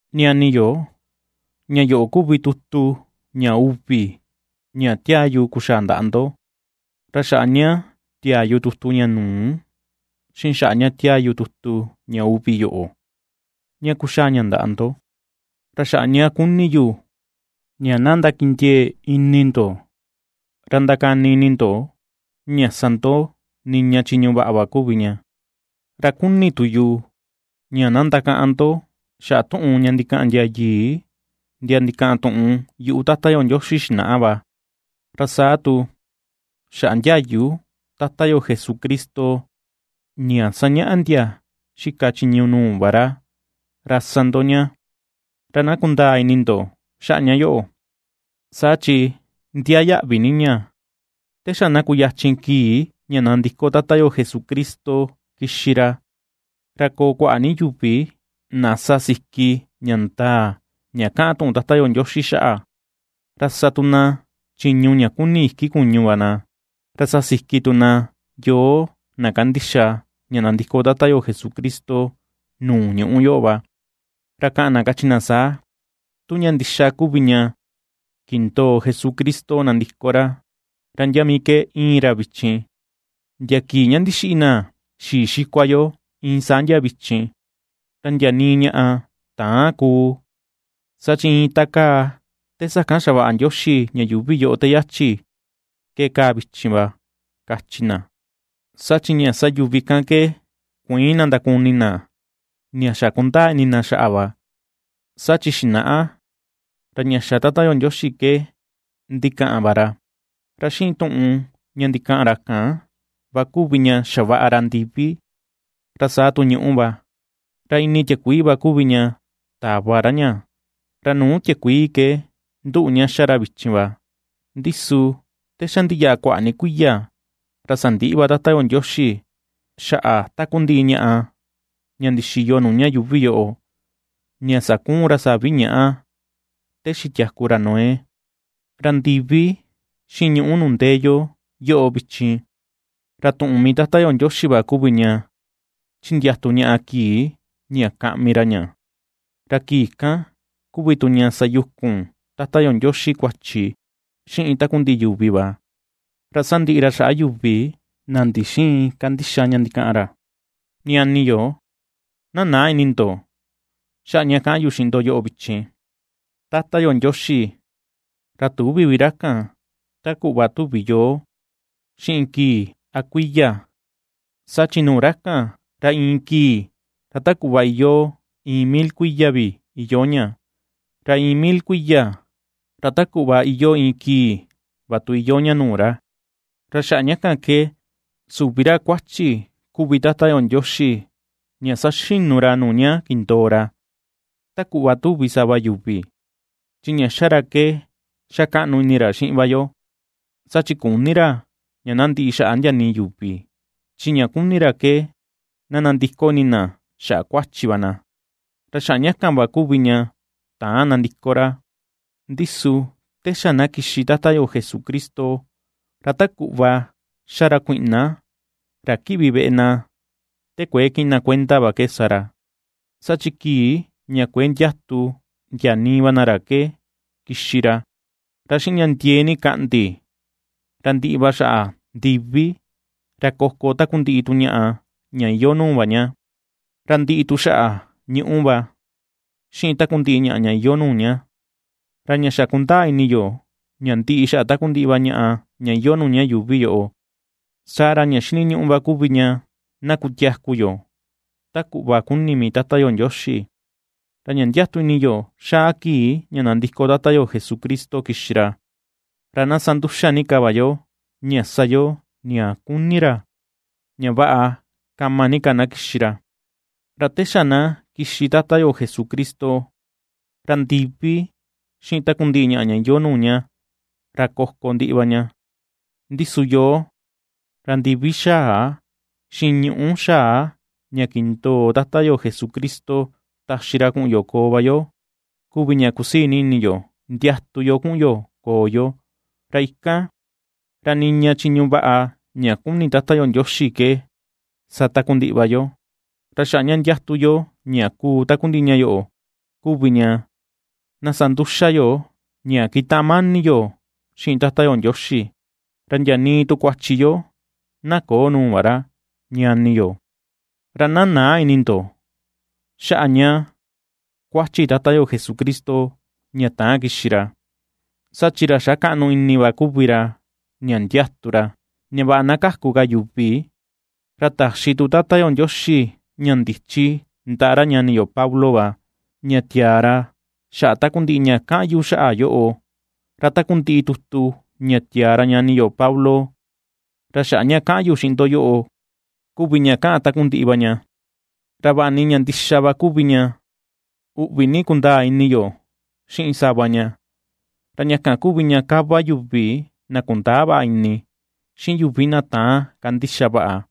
Ñani yo, ña yoꞌo kuvi tutu ña uvi ña tiaa yu kuxaa ndaꞌa ndo, ra xaꞌa ña tiaa yu tutu ña nuu, xiꞌin xaꞌa ña ^tiaa yu tutu ña uvi yoꞌo ña kuxaa ña ndaꞌa ndo, ra xaꞌa ña kuni yu ña na ndakindiee ini ndo ra ndakani ini ndo ña sa ndo niña chiñu vaꞌa va kuvi ña. Ra kuni tu yu ña na ndakaꞌan ndo xaꞌa tuꞌun ña ndikaꞌan ndia yii, ndia ndikaꞌan tuꞌun yuꞌu Tata yo Ndioxi xinaꞌa va, ra saa tu xaꞌa ndiayu Tata yo Jesucristo ña ^sañaꞌa ndia ^xika chiñu nuu va ra, ra sa ndo ña. Ra na kundaa ini ndo xaꞌa ña yoꞌo, saa chi ndiaa yaꞌvi ni ña: te xa na kuyachin kii ña nandiko Tata yo Jesucristo kixi ra, ra koo kuaꞌa ni yuvi na sa ^siki ña ndaa ña kaꞌan tuꞌun Tata yo Ndioxi xaꞌa, ra sa tu na chiñu ña kuni iki kuñu va na. Ra sa siki tu na yoo na kandixa ña nandiko Tata yo Jesucristo nuu ñuꞌu yoꞌo va, ra kaꞌan na kachi na saa: “Tu ña ndixa kuvi ña kindoo Jesucristo nandiko ra, ¿ra ndia mii ke íin ra vichin? Ndia kii ña ndixiꞌi na xii xikua yo iin saa ndia vichin, ra ndia nii ñaꞌa täan kuu, saa chi, iin ta kaa te sakan xavaꞌa Ndioxi ña yuuvi te yachi ke kaa vichin va”, kachi na. Saa chi ña ^sa yuvi kan ke kuïin na ndakuni na ña xa kundaa ini na xaꞌa va, saa chi xinaꞌa ra ña xa Tata yo Ndioxi ke ndikaꞌan va ra, ra xiꞌin tuꞌun ña ndikaꞌan ra kan va kuvi ña xavaꞌa ra ndivi, ra saa tu ñuꞌu va, ra ini tiakuii va kuvi ña tava ra ña, ra nuu tiakuii ke nduꞌu ña ^xa ra vichin va. Ndi su te xa ndiyaꞌa kuaꞌa ni kuiya, ra sandiꞌi va Tata yo Ndioxi xaꞌa takundiꞌi ñaꞌa ña ndixiyo nuu ña yuuvi yoꞌo, ña sakuun ra savi ñaꞌa te xitiaku ra Noé. Ra ndivi, xiꞌin ñuꞌu nuu ndee yo, yoꞌo vichin, ra tuꞌun mii Tata yo Ndioxi va kuvi ña ^chindiatu ñaꞌa kii ña kaꞌmi ra ña. Ra kii kan kuvi tu ña sa yukun Tata yo Ndioxi kuachi xiꞌin takundiꞌi yuvi va, ra sandiꞌi ra xaꞌa yuvi na ndixïin kandixa ña ndikaꞌan ra. Ñani yo, na näa ini ndo xaꞌa ña ^kaꞌan yu xiꞌin ndo yoꞌo vichin: Tata yo Ndioxi, ra tüvi vi ra kan, ta kuꞌva tuvi yoo xiꞌin kii a kuiya, saa chi nuu ra kan, ra iin kii, ra ta kuꞌva iyoo iin mil kuiya vi iyoo ña, ra iin mil kuiya ra ta kuꞌva iyoo iin kii va tu iyoo ña nuu ra. Ra xaꞌa ña kan ke, süvi ra kuachi kuvi Tata yo Ndioxi ña saxinu ra nuu ña kindoo ra, ta kuꞌva tuvi sava yuvi. Chi ña xa ra ke xa kaꞌnu ini ra xiꞌin va yo, saa chi küni ra ña na ndiꞌi xaꞌa ndia nii yuvi; chi ña kuni ra ke na nandiko ini na xaꞌa kuachi va na. Ra xaꞌa ña kan va kuvi ña täan nandiko ra. Ndi su te xa na kixi Tata yo Jesucristo, ra ta kuꞌva ^xa ra kuiꞌna ra kiꞌvi veꞌe na te kuëe kiꞌin na kuenda va ke sa ra, saa chi kii ña kuëe ndiatu ndia nii va na ra ke kixi ra; ra xiꞌin ña ndiee ni kaꞌndi ra ndiꞌi va xaꞌa ndivi, ra koko takundiꞌi tu ñaꞌa ña iyoo nuu va ña; ra ndiꞌi tu xaꞌa ñuꞌu va, xiꞌin takundiꞌi ñaꞌa ña iyoo nuu ña. Ra ña xa kundaa ini yo ña ndiꞌi xaꞌa takundiꞌi va ñaꞌa ña iyoo ña yuuvi yoꞌo, saa ra ña xiniñuꞌu va kuvi ña na kutiaku yo, ta kuꞌva kuni mii Tata yo Ndioxi. Ra ña ndiatu ni yo xaa kii ña nandiko Tata yo Jesucristo kixi ra, ra na sa nduxa ni ka va yo ña sa yo ña kuni ra, ña vaꞌa kama ni ka na kixi ra. Ra te xa na kixi Tata yo Jesucristo, ra ndivi xiꞌin takundiꞌi ñaꞌa ña iyoo nuu ña, ra koko ndiꞌi va ña. Ndi su yoo, ra ndivi xaa, xiꞌin ñuꞌu xaa ña kindoo Tata yo Jesucristo taxi ra kuꞌun yo koo va yo kuvi ña ^kusii ni ini yo ndiatu yo kuꞌun yo koo yo; ra ikan, ra niña chiñu vaꞌa ña kuni mii Tata yo Ndioxi ke sa takundiꞌi va yo. Ra xaꞌa ña ndiatu yo ña kuu takundiꞌi ña yoꞌo kuvi ña na sa nduxa yo ña kitaꞌan mani yo xiꞌin Tata yo Ndioxi, ra ndia nii tu kuachi yo na köo nuu va ra, ñani yo. Ra na näa ini ndo xaꞌa ña kuachi Tata yo Jesucristo ña täan kixi ra, saa chi ra xa kaꞌnu ini va kuvi ra ña ndiatu ra, ña vaꞌa na kaku ka yuvi. Ra taxi tu Tata yo Ndioxi ña ndichi ndaꞌa ra ñani yo Pablo va ña tiaa ra xaꞌa takundiꞌi ña kaꞌan yu xaꞌa yoꞌo. Ra takundiꞌi tutu ña tiaa ra ñani yo Pablo, ra xaꞌa ña kaꞌan yu xiꞌin ndo yoꞌo kuvi ña kaꞌan takundiꞌi va ña. Ra vaꞌa ni ña ndixa va kuvi ña uꞌvi ni kundaa ini yo xiꞌin sava ña. Ra ña kan kuvi ña kava yuvi na kundäa vaꞌa ini, xiꞌin yuvi na täan kandixa vaꞌa,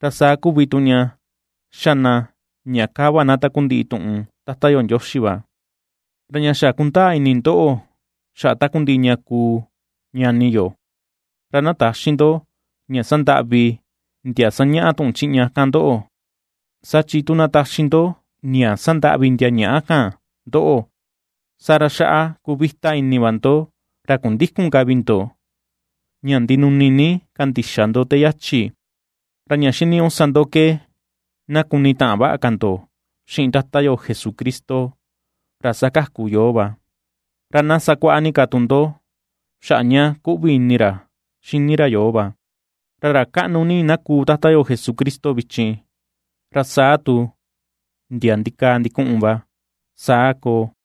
ra saa kuvi tu ña xa na ña kava na takundiꞌi tuꞌun Tata yo Ndioxi va. Ra ña xa kundaa ini ndoꞌo xaꞌa takundiꞌi ña kuu, ñani yo, ra na täxi ndo ña sandaꞌvi ndia sañaꞌa tuꞌun chiꞌña kan ndoꞌo, saa chi tu na taxi ndo ña sandaꞌvi ndia ñaꞌa kan ndoꞌo, saa ra ^xaꞌa kuvita ini va ndo ra kundïkun ka vi ndo ña ndinuni ni kandixa ndo te yachi. Ra ña xiniñuꞌu sa ndo ke na kunitaꞌan vaꞌa ka ndo xiꞌin Tata yo Jesucristo, ra ^sakaku yoo va, ra na sakuaꞌa ni ka tu ndo xaꞌa ña kuꞌvi ini ra xini ra yoo va. ¡Ra ra kaꞌnu ni na kuu Tata yo Jesucristo vichin, ra saa tu ndia ndikaa ndikuꞌun va! Saa koo.